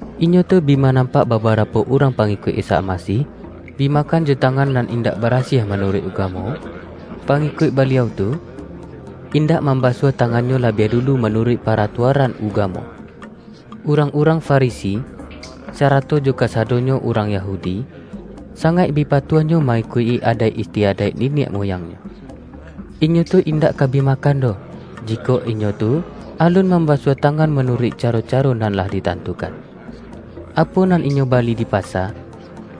Inyo tu bi ma-nampak babarapo urang pangikuik Isa Almasih, bi makan jo tangan nan indak barasiah manuruik ugamo, pangikuik Baliau tu, indak mambasuah tangannyo labiah dulu manuruik pa-ratuaran ugamo. Urang-urang Farisi, sarato jo ka-sadonyo urang Yahudi, sangaik bi pa-tuahnyo ma-ikuik-i adaik istiadaik ni-niak muyangnyo. Inyo tu indak ka bi makan doh, jikok inyo tu alun mam-basuah tangan manuruik caro-caro nan lah ditantukan. Apo nan inyo bali di pasa,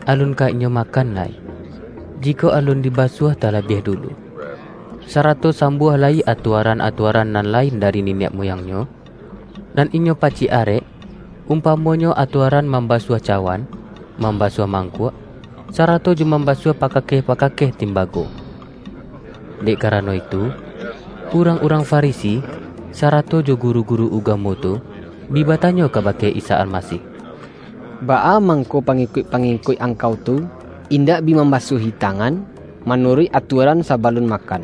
alun ka inyo makan lai, jikok alun dibasuah talabiah dulu. Sa-rato sambuah lai atuaran-atuaran nan lain dari niniak muyangnyo, nan inyo pacik arek; umpamonyo atuaran mam-basuah cawan, mambasuah mangkuak, sarato jo mambasuah pakakeh-paka-keh timbago. Dek karano itu, urang-urang Fa-risi, sarato jo guru-guru ugamo tu, bi batanyo kabake Isa Almasih,”Baa mangko pangikuik-pangikuik Angkau tu, indak bi mambasuahi tangan ma-nuruik atuaran sabalun makan?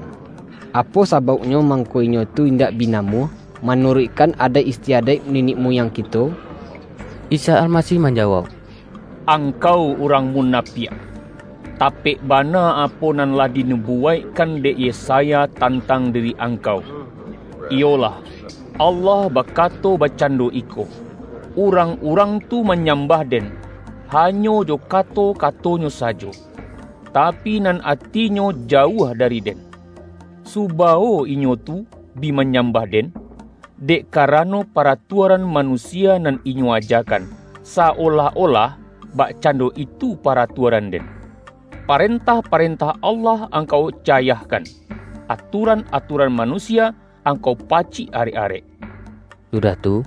Apo sabauknyo mangko inyo tu indak bi namuah, manuruikkan adaik istiadaik niniak muyang kito?” Isa Almasih manjawauk,”Angkau urang munapiak! Tapek bana apo nan lah dinubuwaikkan dek Yesaya tan-tang diri angkau, iyolah, ’Allah bakato bakcando iko, Urang-urang tu manyambah Den, hanyo jo kato-katonyo sajo, tapi nan atinyo, jauah dari Den. Subawo inyo tu bi manyambah Den, dek karano, paratuaran manusia nan inyo ajakan, sa-olah-olah bakcando itu paratuaran-Den!’ Parentah-parentah Allah angkau cayahkan, atuaran-atuaran manusia, angkau pacik arek-arek.” Sudah tu,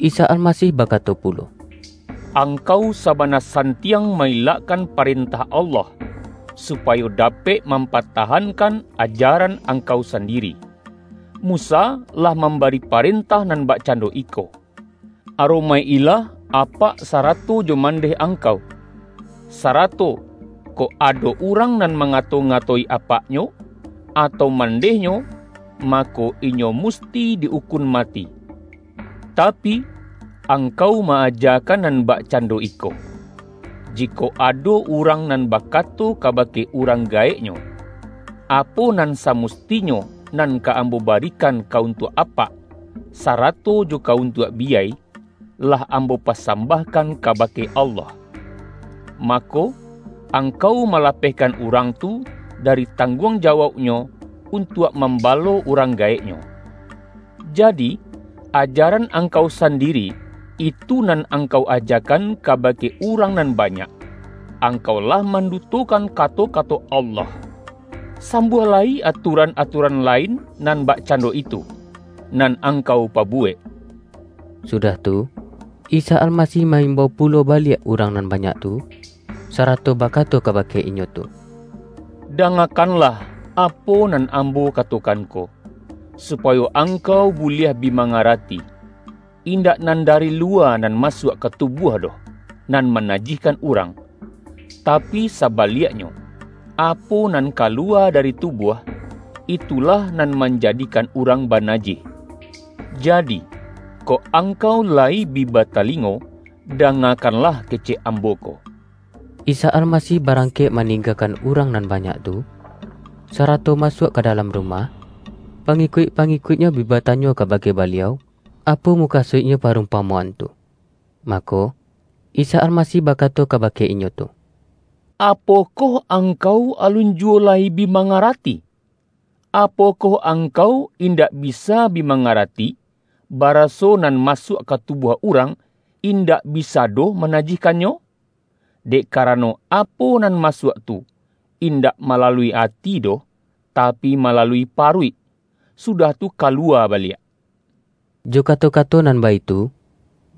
Isa Almasih bakato pulo,”Angkau sabana santiang ma-ilakkan parentah Allah, supayo dapek mampatahankan, ajaran angkau sandiri. Musa lah mambari parentah nan bakcando iko, ’Aromaik-ilah apak sa-rato jo mandeh angkau.’ sarato, ’Kok ado urang nan mangato-ngatoi apak-nyo, atau mandehnyo, mako, inyo mus-ti di ukun mati.’ Tapi, angkau ma-ajakan nan bakcando iko: Jikok ado urang nan bakato kabake urang ga-eknyo, ’Apo nan samustinyo nan ka ambo barikan ka untuak apak, sarato jo ka untuak biyai, lah ambo pasam-bahkan kabake Allah.’ mako, ang-kau malapehkan urang tu, dari tang-guang jawauknyo, untuak mambalo urang gaeknyo. Jadi, ajaran angkau sandiri, itu nan angkau ajakan kabake urang nan banyak, angkau lah man-dutokan kato-kato Allah. Sambuah lai atuaran-atuaran lain nan bakcan-do itu, nan angkau pabuwek.” Sudah tu, Isa Almasih ma-imbau pulo baliak urang nan banyak tu, sara-to bakato kabake inyo tu,”Dangakan-lah apo nan Ambo katokan ko, supayo angkau buliah bi mangarati! Indak nan dari luwa nan masuak ka tubuah doh, nan manajihkan urang. Tapi, saba-liaknyo, apo nan kaluwa dari tubuah, itulah nan manjadikan urang banajih. Jadi, kok angkau layi bi batalingo, dangakanlah kecek Ambo ko.]" Isa Almasih barangkek maning-gakan urang nan banyak tu, sarato masuak ka dalam rumah, pangikuik-pangikuik-Nyo bi batanyo kabake Ba-liau, apo mukasuiknyo parumpamoan tu. Mako, Isa Almasih bakato kaba-ke inyo tu,”Apokoh angkau alun ju-wo lai bi mangarati? Apokoh angkau indak bisa bi mangarati, baraso nan masuak ka tubuah urang, indak bisa doh manajihkannyo? Dek karano, apo nan masuak tu, indak malalui ati doh, tapi, malalui paruik, sudah tu ka-luwa baliak.” Jo kato-kato nan baitu,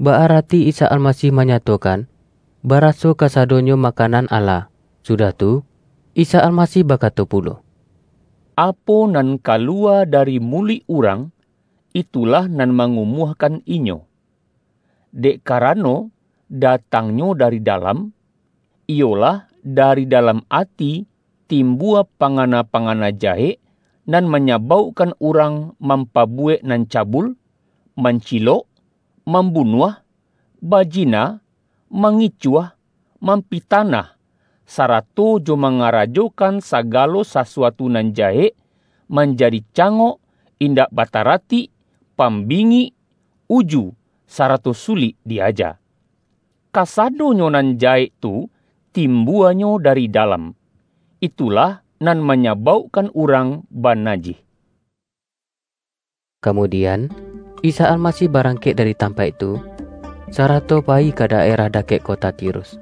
ba-arati Isa Almasih manyatokan, ba-raso kasadonyo makanan ala. Sudah tu, Isa Almasih bakato pulo,”Apo nan kaluwa dari muluik urang, itulah nan mangumuahkan inyo. Dek karano, datangnyo dari dalam, iyolah, dari dalam ati timbua pangana-panga-na jahek, nan manyabaukkan urang mampabuwek nan cabul, mancilok, mambunuah, bajina, mangicuah, mampitanah, sarato jo mangarajokan sagalo sasuatu nan jahek, manjadi ca-ngok, indak bataratik, pambingik, uju, sarato sulik di-aja. Kasadonyo nan jahek tu timbuanyo dari dalam, itulah nan manyabaukkan urang banajih.” Kamudian, Isa Almasih barangkek dari tampaik tu, sarato payi ka daerah dakek kota Tirus.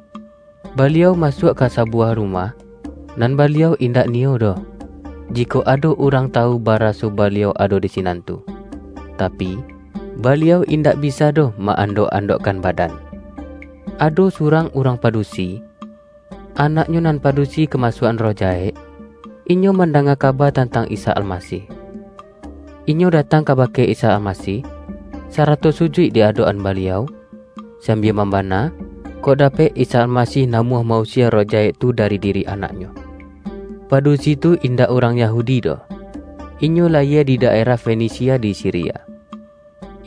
Baliau masuak ka sa-buwah rumah, nan Baliau indak niyo doh, jikok ado urang tawu baraso Ba-liau ado di sinan tu. Tapi, Baliau indak bisa doh ma-andok-andokkan badan. Ado surang urang padusi, anaknyo nan padusi kamasuak-an roh jahek, inyo mandanga kaba tantang Isa Almasih. Inyo datang kabake Isa Almasih, sa-rato sujuik di adok-an Baliau, sambia mambana, kok dapek Isa Almasih na-muah ma-usie roh jahek tu dari diri anaknyo. Padusi tu indak urang Ya-hudi doh, inyo layie di daerah Fenisia di Siria.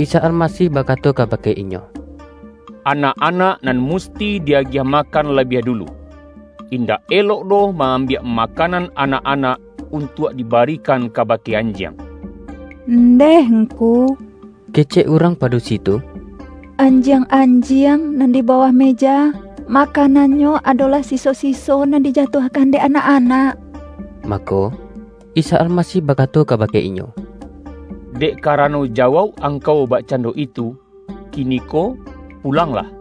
Isa Almasih bakato kabake inyo,”Anak-anak nan musti di-agiah makan labiah dulu. Indak elok doh ma-ambiak makanan anak-anak, untuak dibarikan kabake anjiang.” ”Ndeh Ngku,” kecek urang padusi tu,”anjiang-anjiang nan di bawah me-ja, makanannyo adolah siso-siso nan dijatuahkan dek anak-anak!” Mako, Isa Almasih bakato kabake inyo,”Dek karano jawauk angkau bakcando itu, kiniko pulanglah;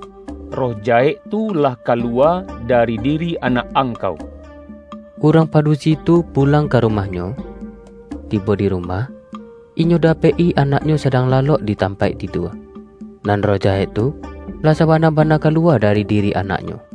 roh jahek tu lah kaluwa dari diri anak angkau!” Urang padusi tu pulang ka rumah-nyo. Tibo di rumah, inyo dapek-i anak-nyo sadang lalok di tampaik tidua, nan roh jahek tu lah sabana-bana kaluwa dari diri anaknyo.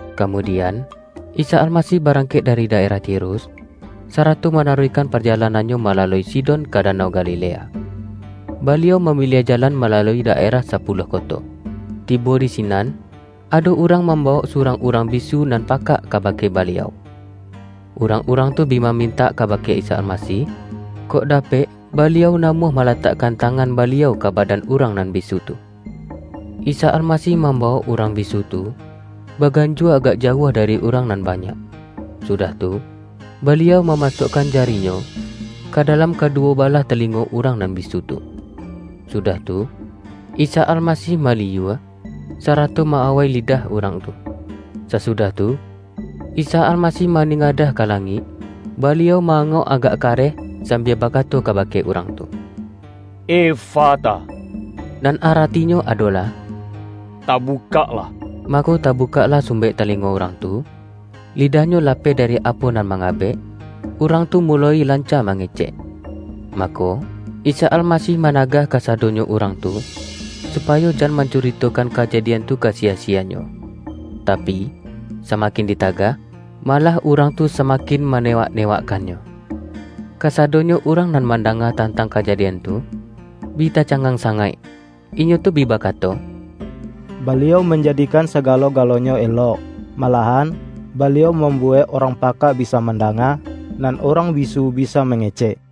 Kamudian, Isa Almasih barangkek dari daerah Tirus, sarato manaruihkan pajalanan-Nyo malalui Sidon ka danau Galilea. Baliau mamiliah jalan malalui daerah Sapuluah Koto. Tibo di sinan, ado urang mambawok surang urang bisu nan pakak kabake Baliau. Urang-urang tu bi mamintak kabake Isa Almasih, kok dapek Baliau namuah malatakkan ta-ngan Baliau ka badan urang nan bisu tu. Isa Almasih mambawok urang bisu tu, baganjua agak jauah dari urang nan ba-nyak, sudah tu, Baliau mamasuakkan ja-ri-Nyo, ka dalam kaduwo balah talingo urang nan bisu tu. Sudah tu, Isa Almasih maliyua, sarato ma-awai lidah urang tu. Sasudah tu, Isa Almasih maningadah ka langik, Baliau ma-angok agak kareh sambia bakato kabake urang tu,”Efata,” nan aratinyo adolah,”Tabukaklah!” Mako tabukaklah sumbek talingo urang tu, lidahnyo lapeh dari apo nan mangabek, urang tu muloi lanca mange-cek. Mako, Isa Almasih managah ka-sadonyo urang tu, supayo jan mancuri-tokan kajadian tu ka siya-siyanyo. Tapi, samakin ditagah, malah urang tu sama-kin manewak-newakkannyo. Kasado-nyo urang nan mandanga tantang kaja-dian tu, bi tacangang sangaik. Inyo tu bi bakato,”Baliau manjadikan sagalo-galo-nyo elok! Malahan, Baliau mambuwek urang pakak bisa mandanga, nan urang bisu bisa mangecek!”